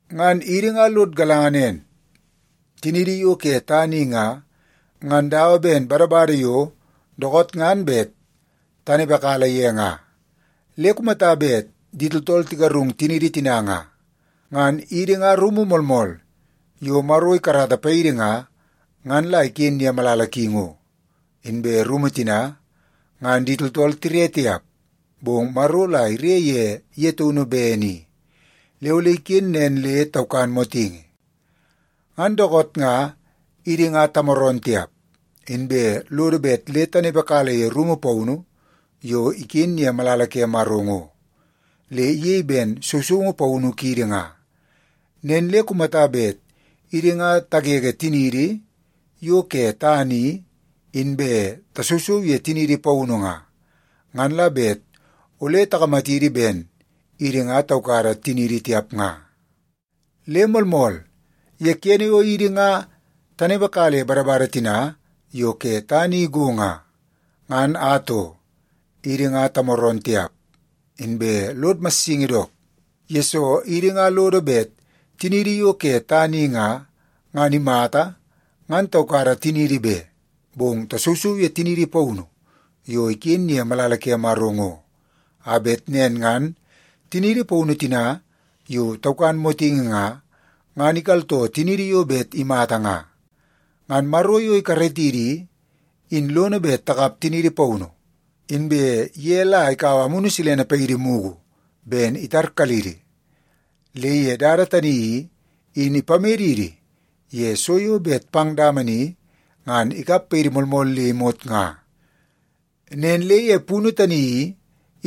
Ngan idi nga lod galanga nen, tiniidi yo ke tana i nga, ngan dawa ben badabada yo dookoot ngan bet tanepekala ye nga. Le kumata bet di tooltool tigarung tiniidi tina nga, ngan idi nga rumu moolmool yo Maro ikarata paidi nga, ngan la iken ye malala ki ngo. Inbe rumu tina, ngan di tooltool tire tiap, bong Maro la ire ye ye taunu bene i, le ole iken nen le taukan motingi. Ngan dookoot nga idi nga tamooroon tiap, inbe lodo bet le tanepekala ye rumu paunu yo iken ye malala ke Maro ngo, le iyei ben sousoungu paunu kiidi nga. Nen le kumata bet idi nga tagege tiniidi yo ke tana i, inbe tasousou ye tiniidi paunu nga, ngan la bet ole takamatidi ben idi nga taukada tiniidi tiap nga. Le moolmool, ye kene yo idi nga tanepekala ye badabada tina yo ke tana i go nga, ngan atoo, idi nga tamooroon tiap, inbe lod massingi dook. Yesoo, idi nga lodo bet tiniidi yo ke tana i nga, ngan imata ngan taukada tiniidi be, bong tasousou ye tiniidi paunu yo iken ye malala ke Maro ngo, a bet nen ngan tiniidi paunu tina yo taukan motingi nga, ngan ikaltoo tiniidi yo bet imata nga. Ngan Maro yo ikaratidi i, in lono bet takap tiniidi paunu. Inbe ye la ikaua Amunu Silene paidi mugu ben itarkalidi, le ye dada tani i, in ipamedidi ye so yo bet pang dama ni ngan ikap paidi moolmool le imot nga. Nen le ye punu tani i,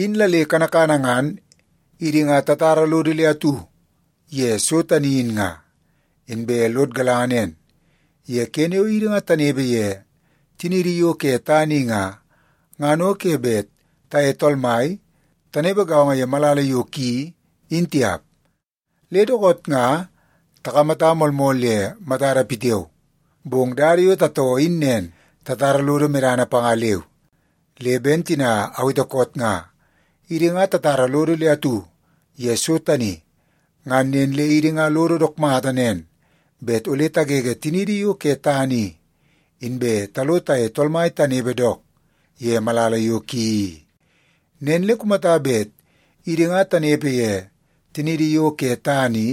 in la le kanakana ngan idi nga tatara lodo le atu ye so tani in nga. Inbe lod galanga nen, ye kene yo idi nga tanepe ye tiniidi yo ke tana i nga, ngan o ke bet taye Tool Mai tanepe gaongo ye malala yo ki in tiap. Le dookoot nga takamata moolmool ye matada pitiao, bong dada yo tatoo in nen, tatara lodo medana panga leu. Le ben tina awete koot nga, idi nga tatara lodo le atu ye so tani. Ngan nen le idi nga lodo dook mata nen bet ole tagege tiniidi yo ke tana i, inbe talo taye Tool Mai tanepe dook ye malala yo ki i. Nen le kumata bet idi nga tanepe ye tiniidi yo ke tana i,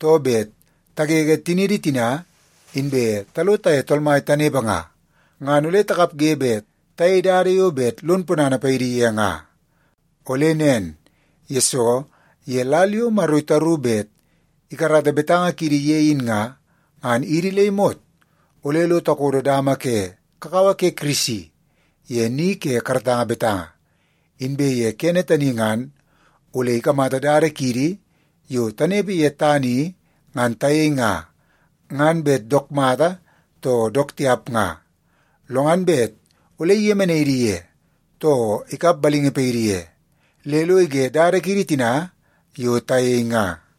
too bet tagege tiniidi tina inbe talo taye Tool Mai tanepe nga, ngan ole takapge bet tayei dada yo bet lon ponana paidi ye nga. Ole nen, yesoo ye lal yo Maro itaru bet ikarata betanga kiidi ye in nga, ngan idi le imot ole lo takodo dama ke kakawa ke Kirisi ye ni ke karatanga betanga. Inbe ye kene tani ngan ole ikamata dada kiidi yo tanepe ye tana i ngan tayei nga, ngan bet dook mata too dook tiap nga. Lo ngan bet ole iyemenai idi ye, too ikap balingi paidi ye, le lo ige dada kiidi tina yo tayei nga.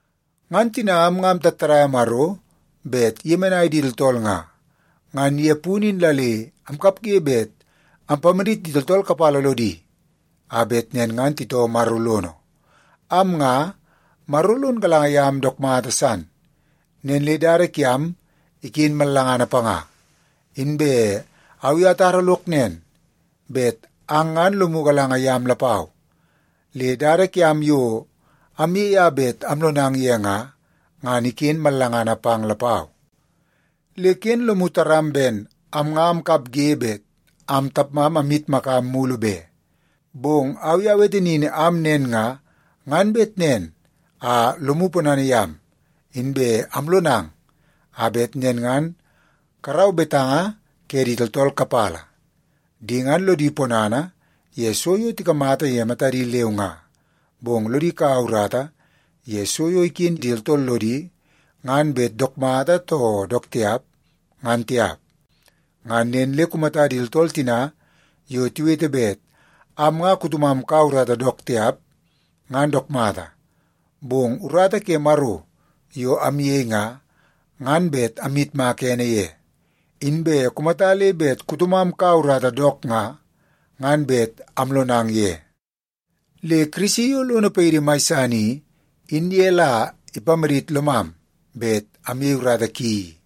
Ngan tina am nga amtattadaia Maro bet iyemenai di tooltool nga, ngan ye punu in la le amkapge bet ampamadit di tooltool kapala lodi a bet nen ngan titoo Maro lono. Am nga, Maro lon galanga yam dook mata san, nen le dada kiam iken mallangana panga. Inbe au i atara lok nen bet ang ngan lomu galanga yam lapau, le dada kiam yo amyei a bet amlonang ye nga, ngan iken mallangana pang lapau. Le ken lomu taram ben am nga amkapge bet am tapmam amyitmakam mulu be. Bong au i awete nin am nen nga, ngan bet nen a lomu ponana yam, inbe alonang a bet nen ngan karau betanga ke di tooltool kapala. Di ngan lodi ponana ye so yo tikamata ye matadi leu nga, bong lodi kaua urata ye so yo iken di tooltool lodi, ngan bet dook mata too dook tiap, ngan tiap. Ngan nen le kumata di tooltool tina yo tiwete bet am nga kutomam kaua urata dook tiap, ngan dook mata. Bong urata ke Maro yo amyei nga, ngan bet amyitmaka ene ye. Inbe kumata le bet kutomam kaua urata dook nga, ngan bet amlonang ye. Le Kirisi yo lono paidi mai san i, in ye la ipamadit lomam bet amyei urata ki i.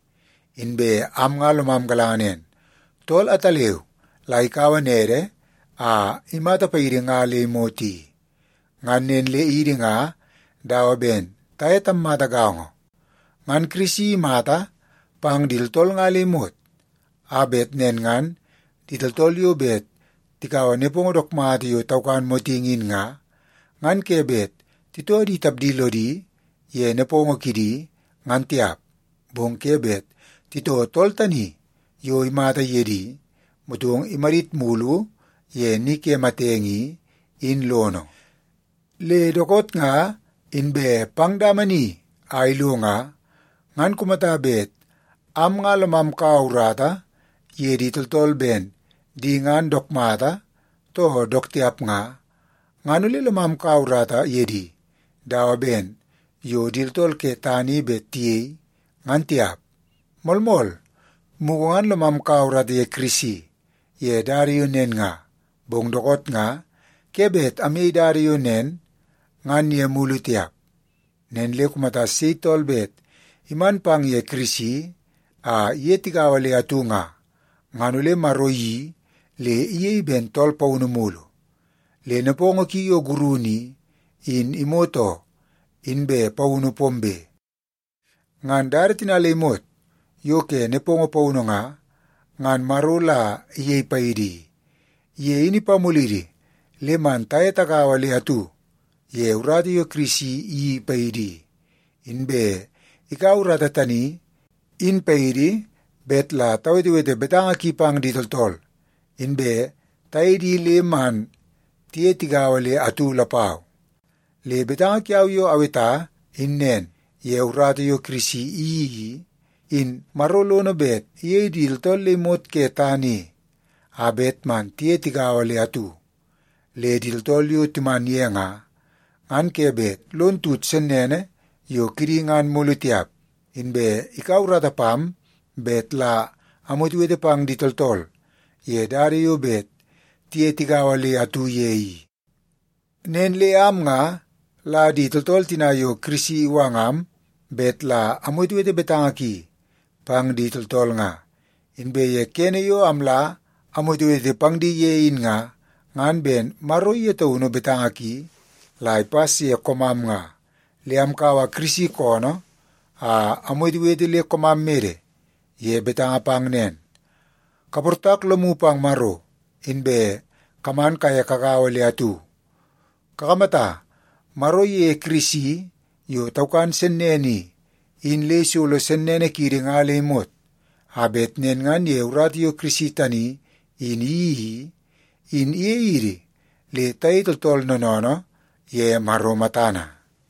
Inbe am nga lomam galanga nen, tool ataleu la ikaua nede a imata paidi nga le imot i. Ngan nen le idi nga dawa ben taye tammata gaongo. Ngan Kirisi imata pang di tooltool nga le imot, a bet nen ngan di tooltool yo bet tikaua nepongo dook mata yo taukan motingi in nga, ngan ke bet titoo di tapdi lodi ye nepongo kidi, ngan tiap, bong ke bet titoo tool tani yo imata ye di, motong imadit mulu ye ni ke matenge i, in lono. Le dookoot nga inbe pang dama ni a ilo nga, ngan kumata bet am nga lomam kaua urata ye di tooltool ben di ngan dook mata too dook tiap nga, ngan ole lomam kaua urata ye di dawa ben yo di tooltool ke tana i bet tiyei, ngan tiap. Moolmool, mugu ngan lomam kaua urata ye Kirisi ye dada yo nen nga, bong dookoot nga ke bet amyei dada yo nen ngan ye mulu tiap. Nen le kumata sei tool bet iman pang ye Kirisi a iye tigaua le atu nga, ngan ole Maro iyeii le iyei ben tool paunu mulu. Le nepongo ki yo gurunu i, in imot oo, inbe paunu pombe. Ngan dada tina le imot yo ke nepongo paunu nga, ngan Maro la iyei paidi i. Ye in ipamulidi le man taye tagaua le atu ye urata yo Kirisi iyeii paidi i, inbe ikaua urata tani in paidi bet la tawetewete betanga ki pang di tooltool, inbe tayei di le man tiye tigaua le atu lapau. Le betanga kiau yo aweta in nen, ye urata yo Kirisi iyeii i, in Maro lono bet iyei di tooltool le imot ke tana i a bet man tiye tagaua le atu. Le di tooltool yo timan ye nga, ngan ke bet lon tut sennene yo kidi ngan mulu tiap. Inbe ikaua urata pam bet la amwetewete pang di tooltool ye dada yo bet tiye tigaua le atu ye i. Nen le am nga la di tooltool tina yo Kirisi iwangam bet la amwetewete betanga ki pang di tooltool nga. Inbe ye kene yo amla amwetewete pang di ye in nga, ngan ben Maro ye taunu betanga ki la ipas ye koomam nga. Le amkaua Kirisi koonoo a amwetewete le koomam mede ye betanga pang nen, kaportak lomu pang Maro, inbe kaman kaye kagaua le atu. Kakamata, Maro iyeie Kirisi yo taukan sennene i, in le isolo sennene kiidi nga le imot, a bet nen ngan ye urata yo Kirisi tani in iyeii i, in iyei idi le tayei tooltool noonoonoo ye Maro matana.